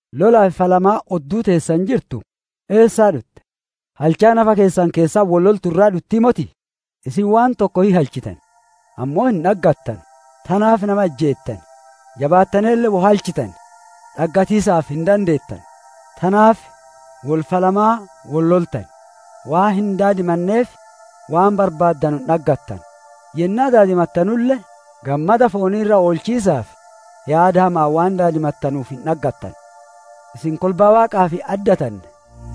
Lolaa fi falmiin odduu teessan jirtu, eessaa dhutte? Halchaa nafa keessan keessatti wol loltu irraa dhuttii motii? Isin waan tokko hin halchitan, ammoo hin dhaggattanu; tanaaf nama ijjeettan. Jabaattaneelle woy halchitan, dhaggatiisaaf hin dandeettanu; tanaaf wol falmaa wol loltan. Waan hin daadimanneef, waan barbaaddanu hin dhaggattanu. Yennaa daadimattanulle, gammada foonii irra oolchiisaaf, yaada hama'aan waan daadimattanuuf hin dhaggattanu. Isin kolbaa Waaqaaf hin addatanne!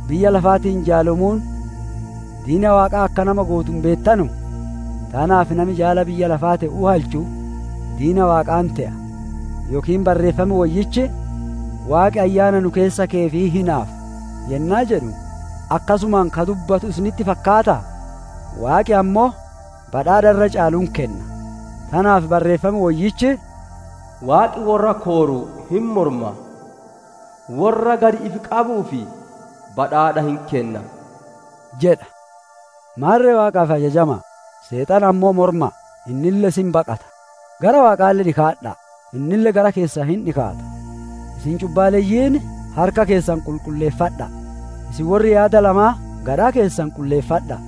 Biyya lafaatiin jaalomuun diina Waaqaa akka nama gootu hin beettanuu? Tanaaf nami jaala biyya lafaa te'uu halchu, diina Waaqaa hin te'a. Yookiin Barreeffam Woyyichi, «Waaqi, ayyaana nu keessa keyeef hin hinaafa» yennaa jedhu, akkasumaan ka dubbatu isinitti fakkaataa? Waaqi ammoo badhaadha irra caalu hin kenna; tanaaf Barreeffam Woyyichi, «Waaqi worra kooru hin morma, worra gad ifi qabuuf badhaadha hin kenna» jedha. Maarre Waaqaaf ajajama'a; Seexana ammoo morma'a, innille isin baqata. Gara Waaqaa dhikaadha'a, innille gara keessan hin dhikaata. Isin cubbaaleyyiin, harka keessan qulqulleeffadha'a. Isin worri yaada lamaa, gadhaa keessan qulleeffadha'a.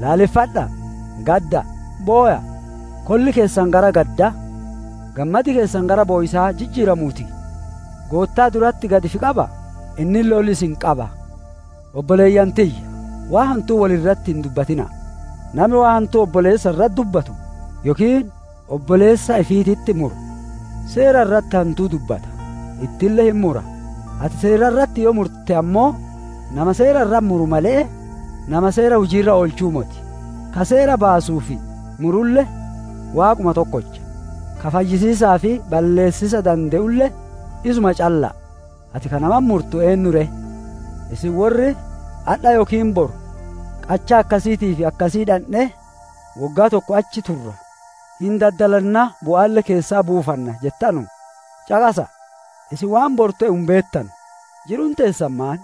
Laaleffadha'a, gadda'a, bowa'a! Kolli keessan gara gaddaa, gammadi keessan gara bowiisaa jijjiiramuu ti. Goottaa duratti gad ifi qaba'a, innille ol isin hin qaba. Obboleeyyan tiyya, waan hantuu wol irratti hin dubbatina'a! Nami waan hantuu obboleessa irratti dubbatu yookiin obboleessa ifiititti muru, seera irratti hantuu dubbata, ittille hin mura; ati seera irratti yoo murte ammoo, nama seera irratti muru malee, nama seera hujii irra oolchuu moti. Ka seera baasuu fi murulle Waaquma tokkocha; ka fayyisiisaa fi balleessiisa dande'ulle isuma calla'a; ati ka namatti murtu eennu ree? Isin worri, «Adha yookiin boru qachaa akkasiitii fi akkasii dhandhee woggaa tokko achi turra, hin daddalanna, bu'aalle keessaa buufanna» jettanu, caqasa'a! Isin waan boru te'u hin beettanu; jiruun teessan maan?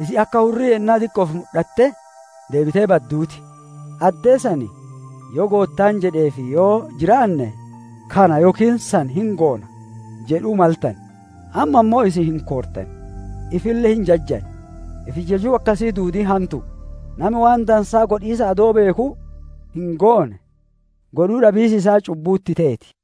Isin akka hurrii yennaa diqqo'oof mudhattee deebitee badduu ti. Addee san, «Yoo Goottaan jedhee fi yoo jiraanne, kana yookiin san hin goona» jedhuu maltane. Amma ammoo isin hin koortan, ifille hin jajjan; ifi jajuun akkasii duudiin hantu'u. Nami waan dansaa godhiisa adoo beekuu, hin goone, godhuu dhabiis isaa cubbuu itti teeti.